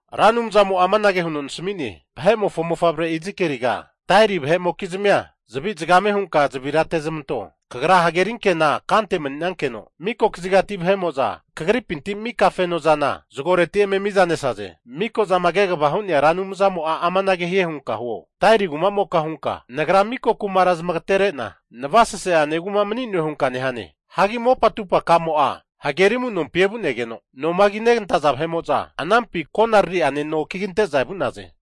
Ra Anumzamo'a amanage huno nasami'ne, Vahe'mofo mofavre Izikieliga, Tairi vahe'mokizmia zavi hunka zavira ate'zmanto. Kagra hageri ankena kante mani'nankeno, miko kazigati vahe'mo'za kagripinti mika fenozana zagoreti eme miza nesaze. Miko'zama Kegvama Hu'nea Ra Anumzamo'a amanage hie hunka zamasamio, Tairi kumamoka hunka, nagra mika kumara zamagatere'na navasase'ane kuma mani'noe hunka nehane. Hagi mopa atupakamo'a hageri amunompi evu'negeno, noma kinegantaza vahe'mo'za anampi konarari'ane no kigante'za vu'naze.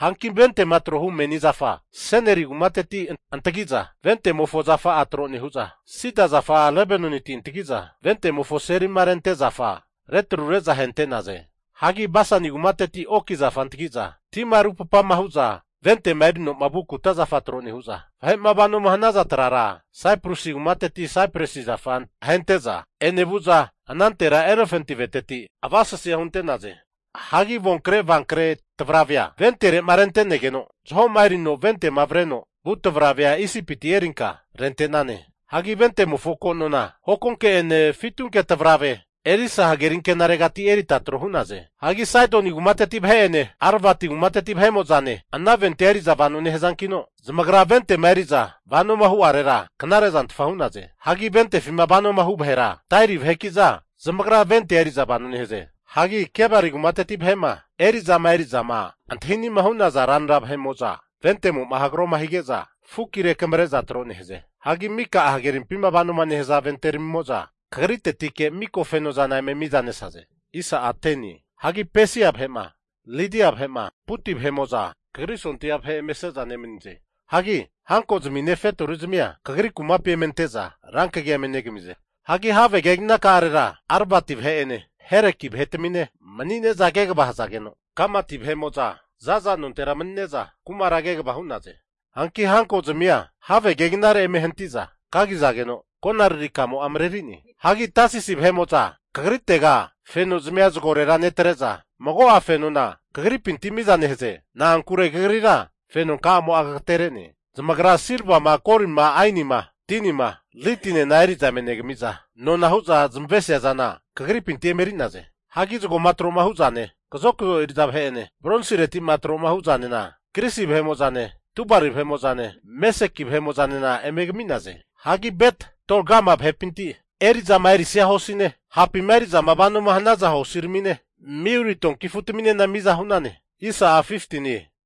Hanki ventema tro'ma hu meni zafa Seniri kumateti antagi'za vente'mofo zafa'a tro nehu'za, sida zafa Lebanoniti antagi'za ventemofo selima rente zafa retrure'za ahente'naze. Hagi Basani kumateti oki zafa antagi'za tima rupapama hu'za ventema erino vu kuta zafa tro nehu'za, vahe'ma vanoma hanaza trara Saiprusi kumateti Saipresi zafa ahente'za enevu'za anantera elefanti aveteti avasesea hunte'naze. Hagi avonkre avankre tavravea ventere'ma rente'negeno zahoma erino ventema avreno vu tavravea Isipiti erinka rente'nane. Hagi ventemofo ko' nona hokonke'ene fitunke tavrave Elisa hageri ankenaregati erita tro hu'naze. Hagi Saidoni kumateti vahe'ene Aravati kumateti vahe'mo'zane ana ventea eri'za vano nehazankino, zamagra ventema eri'za vanoma hu'arera knare'zanfta hu'naze. Hagi ventefima vanoma hu vahera, Tairi vahekiza zamagra ventea eri'za vano nehaze. Hagi Gebali kumateti vahe'ma eri'zama eri'ama antahinima hu'naza ranra vahe'mo'za ventemo'ma hagroma hige'za fukina rekamare'za tro nehaze. Hagi mika'a hagerimpima vano nehaza venteramimo'za kagritetike miko fenozana eme mizanesaze. Hagi Pesia vahe'ma, Lidia vahe'ma, Puti vahe'mo'za kagri sondia vahe emese'za nemanize. Hagi hankozmine fetori zamia kagri kumapi eme ante'za rankagia negamize. Hagi have keginaka'arera Aravati vahe'ene Heleki vahetamine mani'neza kegava hazageno, Gamadi vahe'mo'za za'za nontera manine'za kumara kegava hu'naze. Hanki hankozmia have keginare eme hanti'za kagizageno, konararikamo'a marenerie. Hagi Tasisi vahe'mo'za kagritega fenozmia zagorera netre'za, mago'a fenona kagripinti miza nehaze. Na'ankure kagrira fenonkamo'a kagatere'ne. Zamagra silvama, golima, ainima, tinima, Lidinena eri'za eme negami'za nona hu'za zamavesia zana kagripintira eme eri'naze. Hagi zagoma tro'ma hu'zane, kazokzo eri'za vahe'ene bronsiretima tro hu'zanena Grisi vahemozane, Tubali vahe'mo'zane, Mesheki vahe'mo'zanena eme kami'naze. Hagi Bet-Togarma vahepinti eri'zama erisia hosine, hapima eri'za vano hanaza hosiramine, miuli tonki afutaminena miza hu'nane.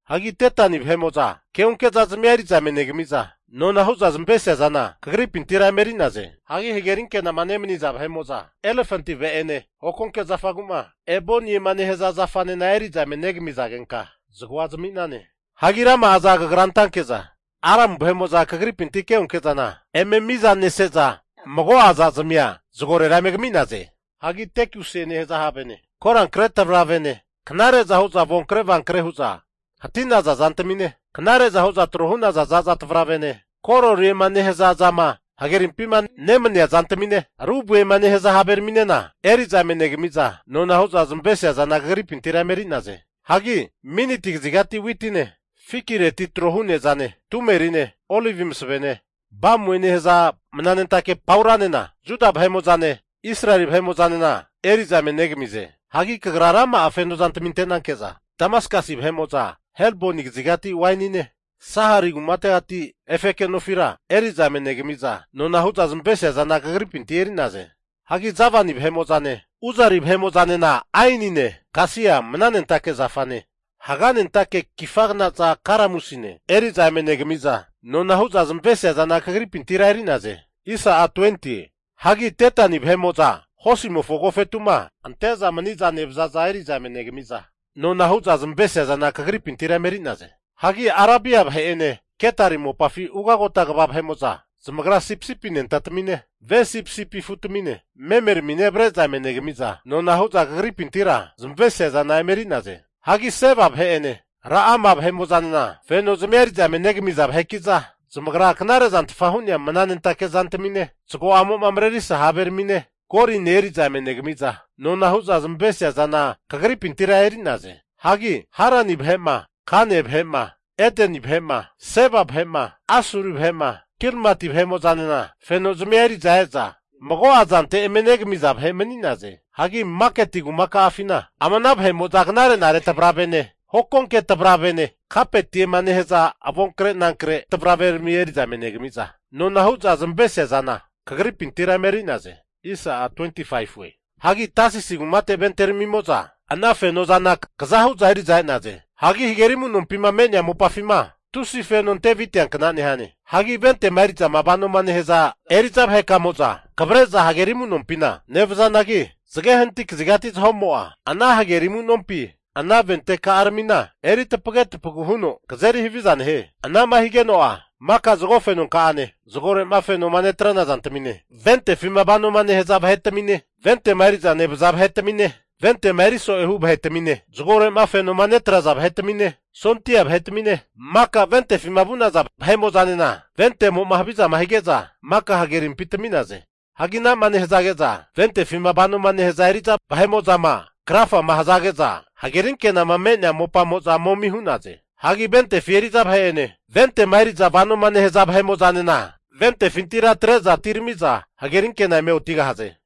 Hagi Detani vahe'mo'za keonke zazmia eri'za eme negamiza, nona hu'za zamavesia zana kagripintira emeri'naze. Hagi hageri anke'nama nemani'za vahe'mo'za elefanti ave'ane hokonke zafagu'ma eboniema nehaza zafanena eri'za eme negamizagenka zagoa zami'nane. Hagi rama'aza kagra ante'nanke'za, Aramu vahe'mo'za kagripinti keonke'zana eme mizanese'za mago'a zazmia zagorera eme kami'naze. Hagi tekusie nehaza havene, korankre tavravene, knare'za huza avonkre avankre hu'za hati'naza zantamine, knare'za huza tro hu'naza za'za tavaravene, kororiema nehaza zama hagerimpi nemanea zantamine, rubie nehaza haveraminena eri'za eme negamiza, nona hu'za zamavesia zana kagripintira eme eri'naze. Hagi Miniti kazigati witine, fikireti trohu nezane, tumerine, olivi masavene, bamue nehaza mananentake pauranena, Juda vahe'mo'zane Israeli vahe'mo'zanena eri'za eme negamize. Hagi kagra rama'a feno zantami ante'nanke'za, Damaskasi vahe'mo'za Helboni kazigati wainine Sahari kumategati efeke nofira eri'za eme negamiza, nona hu'za zamavesia zana kagripintira eri'naze. Hagi Javani vahe'mo'zane Uzari vahe'mo'zanena ainine, kasia mananentake zafane, haganentake kifagnaza kalamusine eri'za eme negamiza, nona hu'za zamavesia zana kagripintira eri'naze. Hagi Detani vahe'mo'za hosimofo agofetu'ma ante'za mani'za nevazaza eri'za eme negami'za, nona hu'za zamavesia zana kagripintira emeri'naze. Hagi Arabia vahe'ene Ketari mopafi ugagota kva vahe'mo'za zamagra sipisipi anentatamine, ve sipisipi afutamine memeramine avre'za eme negamiza nona hu'za kagripintira zamavesia zana emeri'naze. Hagi Seba vahe'ene Ra'ama vahe'mo'zanena fenozmia eri'za eme negamiza vaheki'za, zamagra knare'zanfta hu'nea mananentake zantamine, zago'amo marerisa haveramine, goline eri'za eme negamiza, nona hu'za zamavesia zana kagripintira eri'naze. Hagi Harani vahe'ma, Kane vahe'ma, Edeni vahe'ma, Seba vahe'ma Asuri vahe'ma, Kilmati vahe'mo'zanena fenozmia eri'za eza mago'a zante eme negamiza vahe mani'naze. Hagi maketi kumaka'afina ama ana vahe'mo'za knare'nare tavravene, hokonke tavravene, kapeti'ema nehaza avonkre nankre tavraverami eri'za eme negami'za nona hu'za zamavesia zana kagripintira emeri'naze. Hagi Tasisi kumate venteramimo'za ana fenozana kaza hu'za eri'za e'naze. Hagi hageri amu'nompima me'nea mopafima tusi feno ante aviteankna nehane. Hagi ventema eri'za vanoma nehaza eri'za vahekamo'za kavre'za hageri amu'nompina nevazanagi, zage hanati kazigati zahomo'a, ana hageri amunompi ana venteka'aramina eri tapage tapagu huno kazeri haviza nehie. Anama higeno'a mika zago fenonka'ane, zagore'ma fenoma netrana zantamine, ventefima vanoma nehaza vahetamine, ventema eri'za nevaza vahetamine, ventema eri so'ema hu vahetamine, zagore'ma fenoma netraza vahetamine, sondia vahetamine, maka ventefima vu'naza vahe'mo'zanena ventemo'ma havizama hige'za maka hagerimpi tami'naze. Hagi anama nehazage'za ventefima vanoma nehaza eri'za vahe'mo'zama krafama hazage'za, hagerinkenama me'nea mopamo'za momi hu'naze. Hagi ventefi eri'za vahe'ene ventema eriza vanoma nehaza vahe'mo'zanena ventefintira atre'za atiramiza hagerinkena eme otigahaze.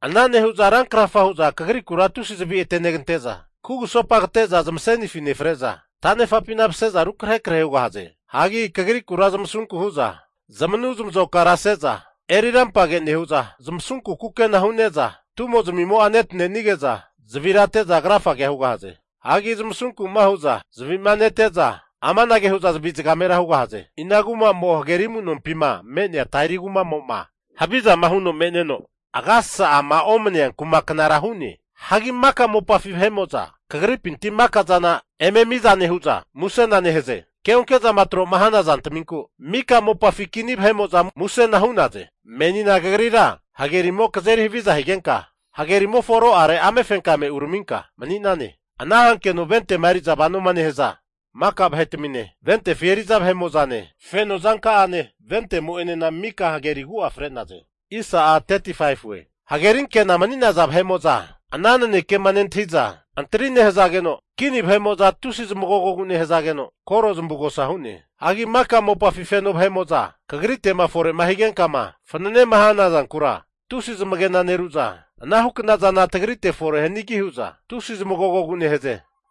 Ana nehu'za rankrafa hu'za kagrikura tusi zavi atenegante'za, kugusopa kate'za zamasenifina nefre'za, tanefa'pina mase'za rukrahe krahe hugahaze. Hagi kagrikura zamasunku hu'za zamanu zamazokara ase'za eri rampage nehu'za, zamasunku kukena hune'za tumo'zmimo'a netanenige'za, zavira ate'za krafa hugahaze. Hagi zamasunku'ma hu'za zavima nete'za amanage hu'za zavi zagamera hugahaze. Inankuma'mo hageri amu'nompima me'nea Tairi kumamo'ma havizama huno me'neno agasasa'ama omnea kumaknara hu'ne? Hagi maka mopafi vahe'mo'za kagripinti maka zana eme mizama nehu'za musena nehaze. Keonke'zama tro'ma hana zantaminkura mika mopafi kini vahe'mo'za musena hu'naze. Menina kagrira hagerimo kazeri haviza higenka, hagerimofo aro'are amefenkame uraminka mani'nane. Ana hankeno vente'ma eri'za vanoma nehaza maka vahe'tamine, ventefi eri'za vahe'mo'zane feno zanka'ane ventemo'enena maka hageri agu'age fre'naze. Hagerinkena mani'naza vahe'mo'za ana nanekema nentahiza antri nehazageno, kini vahe'mo'za tusi zamagogogu nehazageno koro zamavugosa hu'ne. Hagi maka mopafi feno vahe'mo'za kagrite'ma fore'ma higenka fananema hana zankura zamagena neru'za, anahu knazana tagrite fore hanigi hu'za tusi zamagogogu nehaze.